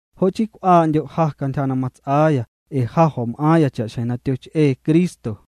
Jo' chii cw'aa'ndyo' ja cantyja na mats'aaya ee ja jo̱m'aaⁿya cha'xjeⁿ na tyoch'ee Cristo.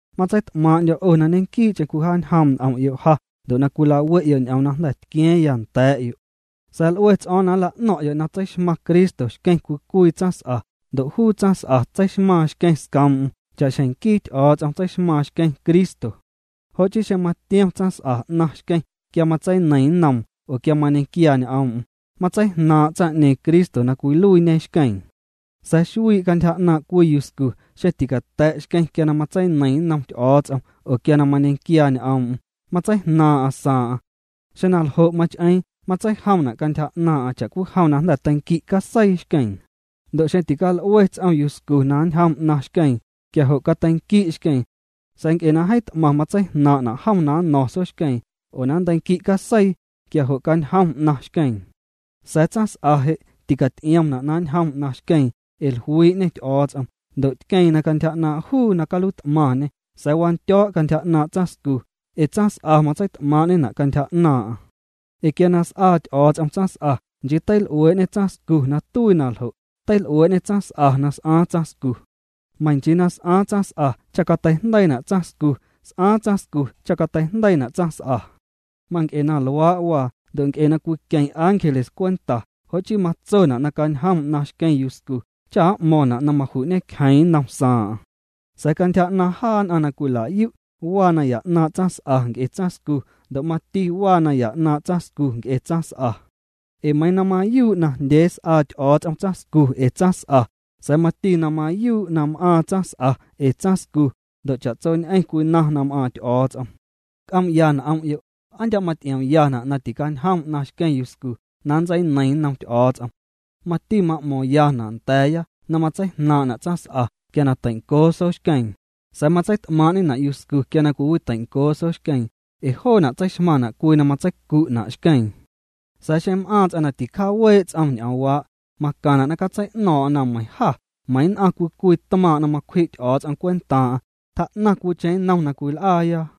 Matseit'maaⁿ'ndyo̱ 'o na ñequii'cheⁿ cwijaañjoom' n'om'yo' ja ndo' cwilawe'yo' ñ'oom na jnda̱ tqua̱a̱ⁿya nda̱a̱'yo' Sa̱a̱ l'ue ts'o̱o̱ⁿ na nla'no̱ⁿ'yo' na tseixmaⁿ Cristo xqueⁿ cwii cwii tsaⁿs'a ndo' juu tsaⁿs'a tseixmaaⁿ xqueⁿ scoom'm cha'xjeⁿ nquii Ty'o̱o̱ts'om tseixmaaⁿ xqueⁿ Cristo. Jo' chii xeⁿ matiom tsaⁿs'a 'naⁿ xqueⁿ quia matseineiⁿ nnoom oo quia mañequiaa ñ'oom'm, matseijnaaⁿ' tsaⁿ'ñeeⁿ Cristo na cwiluiiñe xqueeⁿ. Sa̱a̱ xuii' cantyja 'naaⁿ' cwii yuscu, xeⁿ ticata̱' xqueⁿ quia na matseineiⁿ nnom Ty'o̱o̱ts'om oo quia na mañequiaa ñ'oom'm matseijnaaⁿ'aⁿ saaⁿ'aⁿ. Xeⁿ na ljo' mach'eeⁿ matseijomna' cantyja 'naaⁿ'aⁿ cha'cwijom na jnda̱ teinqui' caseii xqueeⁿ. Ndo' xeⁿ tical'ue ts'om yuscu na ñjom 'naⁿ xqueeⁿ, quia jo' cateinqui' xqueeⁿ. Sa̱a̱ nc'e na jeeⁿ t'maⁿ matseijnaaⁿ'na' jom na nno̱ⁿ soxqueeⁿ oo na nnteinqui' caseii, quia jo' cañjom 'naⁿ xqueeⁿ. Sa̱a̱ tsaⁿs'a je', ticaty'iomna' na ñjom 'naⁿ xqueeⁿ ee jluii'ñe Ty'o̱o̱ts'om ndo' tqueeⁿ na cantyja 'naaⁿ' juu na caluiit'maaⁿ'ñê sa̱a̱ wandyo̱o̱' cantyja 'naaⁿ' tsaⁿscu ee tsaⁿs'a matseit'maaⁿ'ñena' cantyja 'naaⁿ'aⁿ. Ee quia na s'aa Ty'o̱o̱ts'om tsaⁿs'a, nchii teil'uee'ñê tsaⁿscu na tuii na ljo', teil'uee'ñê tsaⁿs'a na s'aaⁿ tsaⁿscu. Meiⁿ nchii na s'aaⁿ tsaⁿs'a cha cateijndeiina' tsaⁿscu, s'aaⁿ tsaⁿscu cha cateijndeiina' tsaⁿs'a. Manc'e na luaa' waa ndo' nc'e na cwiqueⁿ ángeles cwenta, jo' chii matsona' na cañjom 'naⁿ xqueⁿ yuscu cha m'mo̱ⁿna' na maju'ñecjeeⁿ nnom saaⁿ'aⁿ. Sa̱a̱ cantyja 'naaⁿ jaa nn'aⁿ na cwila'yu', waa naya 'naaⁿ' tsaⁿs'a nc'e tsaⁿscu, ndo' mati waa naya 'naaⁿ' tsaⁿscu nc'e tsaⁿs'a. Ee meiiⁿ na mayuu' najndyee s'aa Ty'o̱o̱ts'om tsaⁿscu ee tsaⁿs'a, sa̱a̱ mati na mayuu' na m'aaⁿ tsaⁿs'a ee tsaⁿscu, ndo' cha'tsoñ'eⁿ cwinaⁿ na m'aaⁿ Ty'o̱o̱ts'om. C'oom'ya n'om'yo', ¿aa ndya' maty'iomyana' na ticañjom 'naⁿ xqueⁿ yuscu na nntseineiⁿ nnom Ty'o̱o̱ts'om? Mati ma'mo̱ⁿyana' nda̱a̱ya na matseijnaaⁿ'na' tsaⁿs'a quia na teincoo sooxqueeⁿ, sa̱a̱ matseit'maaⁿ'ñena' yuscu quia na cwiwiteincoo soxqueeⁿ, ee joona' tseixmaⁿna' cwii na matseicu'na' xqueeⁿ. Sa̱a̱ xeⁿ m'aaⁿ ts'aⁿ na ticjaawee' ts'om ñ'oomwaa', macaⁿna' na catsei'no̱o̱ⁿ'o̱ⁿ na meiⁿ jâ meiⁿ nn'aⁿ cwii cwii tmaaⁿ' na macwji' Ty'o̱o̱ts'om cwentaaⁿ'aⁿ, tjaa'naⁿ cwicheⁿ nnom na cwil'aaya.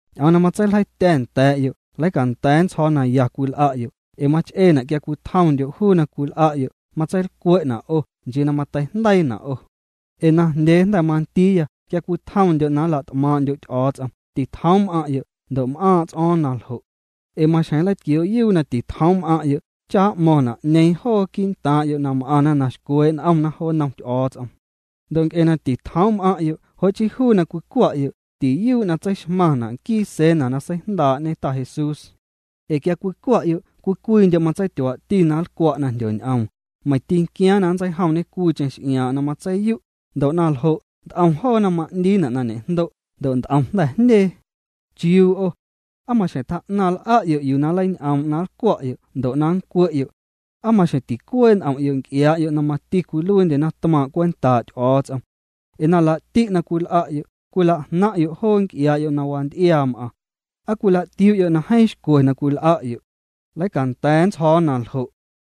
Ñ'oom na matseiljeitya̱ nda̱a̱'yo' leicanda̱a̱ nntsjo̱o̱ na ya cwil'a'yo' ee mach'eena' quia cwitjomndyo' juu na cwil'a'yo' matseilcwe'na' 'o nchii na mateijndeiina' 'o. Ee najndyee jnda̱ mandiiya quia cwitjomndyo' na nla't'maaⁿ'ndyo' Ty'o̱o̱ts'om, titjoom' m'aⁿ'yo', ndo' m'aaⁿ' ts'o̱o̱ⁿ na ljo'. Ee maxjeⁿ nleitquioo'yuu na titjoom' m'aⁿ'yo' cha m'mo̱ⁿna' 'ñeeⁿ joo quii'ntaaⁿ'yo' m'aⁿna na xcwee' n'omna jo nnom Ty'o̱o̱ts'om. Ndo' nc'e na titjoom' m'aⁿ'yo', jo' chii juu na cwicwa'yo', tiyuu' na tseixmaⁿna' nquii Cena na seijndaa'ñe Ta Jesús. Ee quia cwicwa'yo' cwii cwiindyo' matseityuaa'ti na nlcwa' na jndyoñ'oom, meiⁿ tinquiaaⁿ na nntseijomñe cwiicheⁿ x'iaaⁿ'aⁿ na matseiyu', ndo' na ljo' nt'om joona ma'ndiina' na ñe'jndo' ndo' nt'om jnda̱ jndyee. ¿Chiuu 'o? ¿Aa maxjeⁿ tjaa'naⁿ l'a'yo' yuu na nleiñ'oom' na nlcwa'yo' ndo' na nncwe'yo'? ¿Aa maxjeⁿ ticuee' n'om'yo' nc'iaa'yo' na mati cwiluiindye tmaaⁿ' cwentaa' Ty'o̱o̱ts'om? Ee na laa'ti' na cwil'a'yo' cwila'jnaⁿ'yo' joo nc'iaa'yo' na wanty'iaa m'aⁿ. ¿Aa cwila'tiuu'yo' na jeeⁿ xcwe na cwil'a'yo'? Leicanda̱a̱ nntsjo̱o̱ na ljo'.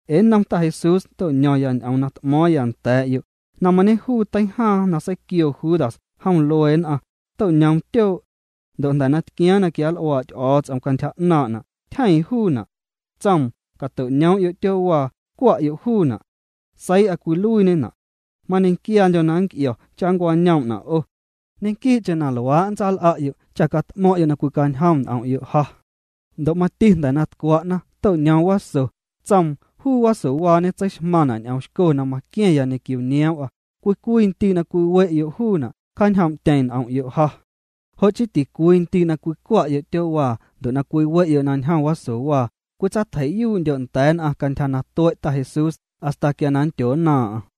Ee nnom Ta Jesús to'ño̱ⁿya ñ'oom na t'mo̱o̱ⁿya nda̱a̱'yo', na mañejuu teijaaⁿ na seiquioo Judas jom luee nn'aⁿ, to'ñoom tyoo' ndo' jnda̱ na tquiaaⁿ na quianl'uaa' Ty'o̱o̱ts'om cantyja 'naaⁿ'na', tyjeeⁿ juuna'. Tsoom: “Cato'ñoom'yo' tyoo'waa, cwa'yo' juuna'. Seii'a cwiluiiñena'. Mañequiaandyo̱ na nnc'io̱ cha nncwañoom'na' 'o. Ñequii'cheⁿ na luaa' nntsal'a'yo' cha cat'mo̱ⁿ'yo' na cwicañjom n'om'yo' ja.” Ndo' mati jnda̱ na tcwa'na, to'ñoom waso, tsoom: “Juu wasowaañe tseixmaⁿna' ñ'oomxco na maqua̱ⁿya ñequio nioom'a. Cwii cwii ndii' na cwiwe'yo' juuna', cjaañjoom'tyeⁿ n'om'yo' ja.” Jo' chii ticwii cwii ndii' na cwicwa'yo' tyoo'waa ndo' na cwiwe'yo' na ñjom wasowaa, cwitsatjei'yuu'ndyo' nda̱a̱ nn'aⁿ cantyja na tue' Ta Jesús, hasta quia na nndyonnaaⁿ'aⁿ.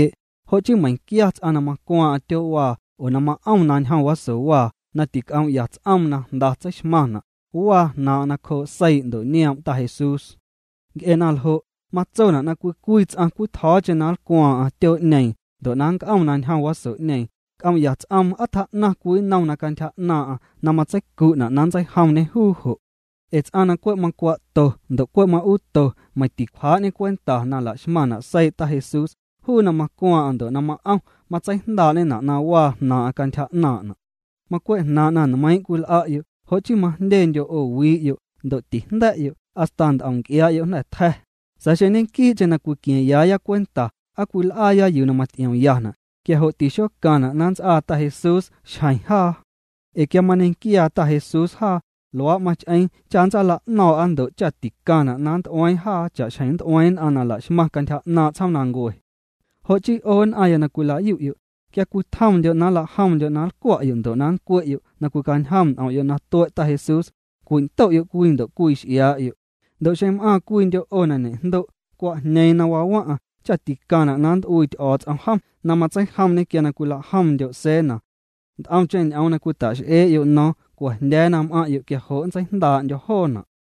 Jo' chii meiⁿquia ts'aⁿ na macwaaⁿ'aⁿ tyoo'waa oo ma'om na ñjom wasowaa na tic'oom'ya ts'oom na jnda tseixmaⁿna', waa jnaaⁿ'aⁿ nacjoo' seii' ndo' nioom' Ta Jesús. Nc'e na ljo', matsona' na cwii cwii ts'aⁿ cwitjo̱o̱cheⁿ na nlcwaaⁿ'aⁿ tyoo'ñeeⁿ ndo' na nnc'om na ñjom waso'ñeeⁿ, c'oom'ya ts'oom na aa tjaa'naⁿ cwii nnom cantyja 'naaⁿ'aⁿ na matseicu'na' na nntseijomñê juu jo'. Ee ts'aⁿ na cwe' macwa'to ndo' cwe' ma'uuto meiⁿ ticwjaa'ñê cwenta na la'xmaⁿna' seii' Ta Jesús, juu na macwaaⁿ'aⁿ ndo' ma'om, matseijndaa'ñena' na waa jnaaⁿ'aⁿ cantyja 'naaⁿ'na'. Macwe' jnaaⁿ' na nmeiiⁿ' cwil'a'yo', jo' chii majndyendyo' 'o wii'yo' ndo' tijnda̱'yo', hasta nt'om nc'iaa'yo' jnda̱ tja̱. Sa̱a̱ xeⁿ ñequii'cheⁿ na cwiqua̱a̱ⁿyaaya cwenta aa cwil'aaya yuu na maty'iomyana', quia jo' tixocaⁿna' na nnts'aa Ta Jesús xjeⁿ jaa, ee quia mañequiaa Ta Jesús jaa, luaa' mach'eeⁿ cha ntsaala'no̱o̱ⁿ'a ndo' cha ticaⁿna' na nnt'ueeⁿ jaa cha'xjeⁿ nnt'ueeⁿ nn'aⁿ na la'xmaⁿ cantyja 'naaⁿ' tsjoomnancue. Jo' chii 'o nn'aⁿya na cwila'yu'yo', quia cwitjomndyo' na nlajomndyo' na nlcwa'yo' ndo' nncwe'yo' na cwicañjom n'om'yo' na tue' Ta Jesús, cwindo'yo' cwii ndo' cwii x'iaa'yo'. Ndo' xeⁿ m'aaⁿ cwiindyo' 'o na ñe'jndo' cwa'jñeeⁿ na waa waⁿ'aⁿ cha' ticaⁿna' na nnt'uii Ty'o̱o̱ts'om jom na matseijomñê quia cwilajomndyo' Cena. Nt'omcheⁿ ñ'oom na cwita'x'ee'yo' no̱o̱ⁿ, cua̱jndya̱a̱ na m'aⁿ'yo' quia jo' nntseijndaa'ndyo̱ joona'.